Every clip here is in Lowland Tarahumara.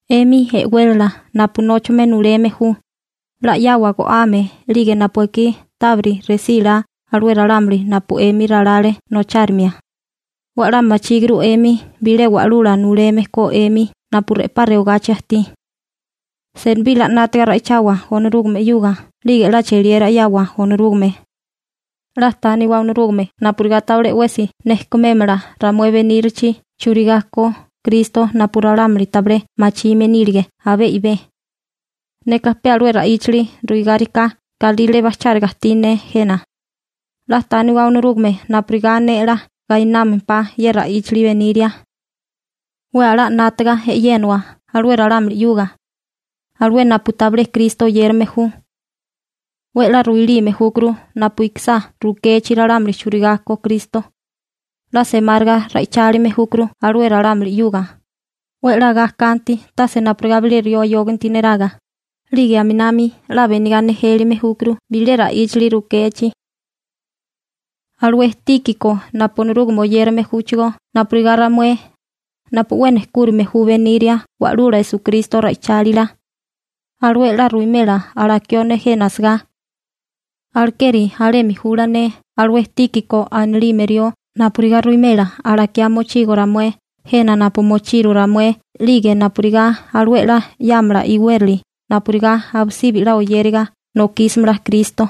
'Emi e'wélala napu nóchame nuleme ju, 'la 'yawa go'ame 'lige napu ekí tábiri resí la alué ralámuli napu 'emi ralale nochárimia. 'We 'la machíguru 'emi bilé Wa'lula Nuleme ko 'emi napu re'pá rewagachi ajtí. Senibí 'la 'nátiga ra'ichawa Onorúgame 'yuga 'lige 'la cheliera 'yawa Onorúgame. 'La tániwa Onorúgame napurigá tabilé 'wesi nejkumémala ramué benírilichi churigá ko Kristo napu ralámuli tabilé machime nílige abé i'bé. Neka pe alué ra'íchali ruigáriká galírale bajcháriga ajtí ne jena. 'La tániwa Onorúgame napurigá ne 'la gainámempá ye ra'íchali beniria. 'We a'lá 'nátaga e'yénawa alué ralámuli 'yuga, alué napu tabilé Kristo oyérame ju. 'We 'la ruilime júkuru napu ikisá rukechi ralámuli churigá ko Kristo. 'La semáriga ra'ichálime júkuru alué ralámuli 'yuga, 'we 'la ga kanti tase napurigá bilé rió ayóganti neraga, 'lige aminami 'la benigá nejélime júkuru bilé ra'íchali rukechi. Alué Tíkiko napu Onorúgame oyérame júchigó napurigá ramué, napu 'we nejkúrime ju beniria Wa'lula Esukristo ra'ichálila. Alué 'la ruwimela alakió ne jena asagá. Alekeri alemi jula ne alué Tíkiko anilime rió napurigá ruwimela alakiá mochigo ramué jena napu mochiru ramué 'lige napurigá alué 'la 'yámala iwérali napurigá abisibi 'la oyériga nokísimala Kristo.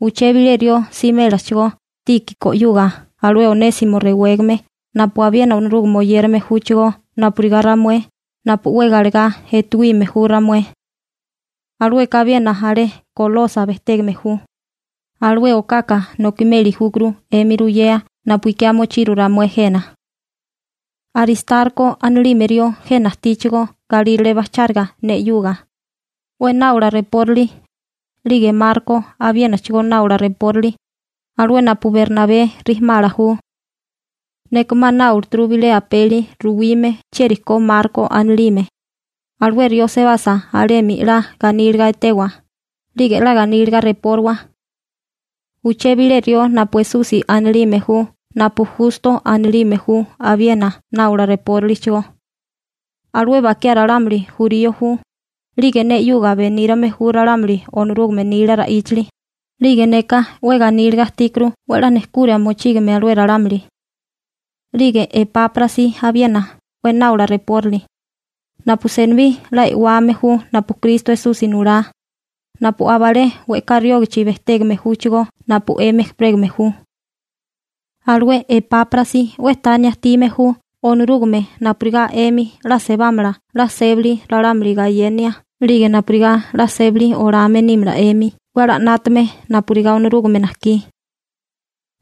Uché bilé rió simélachigó Tíkiko 'yuga alué Onésimo rewégame napu abiena Onorúgame oyérame júchigó napurigá ramué napu 'we galegá etuime ju ramué. Alueka abiena alé Kolosa bejtégame ju. Alué okaka nokimeli júkuru 'emi ruyea napu ikiá mochiru ramué jena. Aristarko anilime rió jena ajtíchigó galírale bajcháriga ne 'yuga, 'we náola reporali, 'lige Marko abiénachigó náola reporali, alué napu Bernabé rijimala ju. Neka 'ma náolaturu bilé apeli ruwime chieri ko Marko anilime. Alué rió sebasa alemi 'la ganíliga etewa, 'lige 'la ganíliga repóriwa. Uché bile rió napu Esusi anilime ju napu Justo anilime ju abiena náwala reporálichigó. Alué bakiá ralámuli jurío ju, 'lige ne 'yuga benírame ju ralámuli Onorúgame nila ra'íchali, 'lige neka 'we ganíliga ajtíkuru 'we 'la nejkura mochígime alué ralámuli. 'Lige Epáprasi abiena 'we náola reporali, napu senibí 'la e'wame ju napu Kristo Esusi nulá, napu aba alé we'ká riógichi bejtégame júchigó napu 'emi ejperégame ju. Alué Epáprasi 'we tania ajtime ju Onorúgame napurigá 'emi 'la sebámala 'la sébali ralámuli gayenia 'lige napurigá 'la sébali olame nímala 'emi 'we 'la 'nátame napurigá Onorúgame najkí.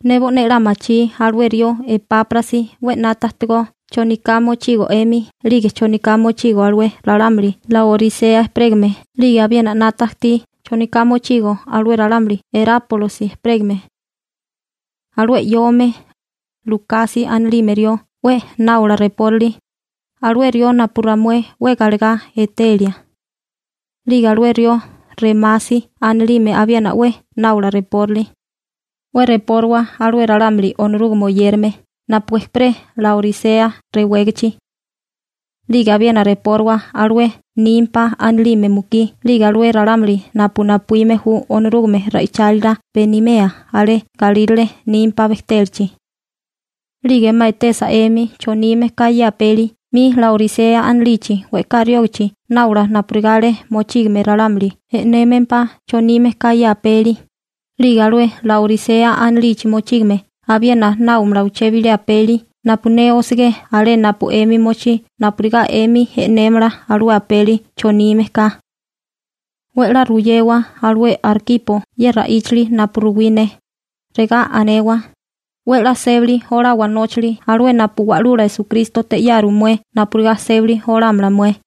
Ne bo'né 'la machí alué rió Epáprasi 'we 'nata ajtigó choniká mochigo 'emi 'lige choniká mochigo alué ralámuli Laorisea ejperégame, 'lige abiena 'nata ajtí choniká mochigo alué ralámuli Erápolosi ejperégame. Alué 'yóome, Lukasi anilime rió 'we náola reporali, alué rió napu ramué 'we galegá etelia. 'Lige alué rió Remasi anilime abiena 'we náola reporali. 'We repóriwa alué ralámuli Onorúgame oyérame napu ejperé Laorisea rewégichi. 'Lige abiena repóriwa alué Nimpa anilime mukí 'lige alué ralámuli napu napuíme ju Onorúgame ra'ichálila benimea alé galírale Nimpa bejtélachi. 'Lige 'ma etesa 'emi chonime ka ye apeli 'mi Laorisea anilichi we'ká riógichi náola napurigá alé mochígame ralámuli e'némempá chonime ka ye apeli, 'lige alué Laorisea anilichi mochígame abiena náomala uché bilé apeli napu ne osegé alé napu 'emi mochí napurigá 'emi e'némala alué apeli chonime ka. 'We 'la ruyewa alué Arkipo ye ra'íchali napu ruwí ne, regá anewa: «'We 'la sébali olawa nóchali alué napu Wa'lula Esukrístote 'yaru mué napurigá sébali olámala mué.»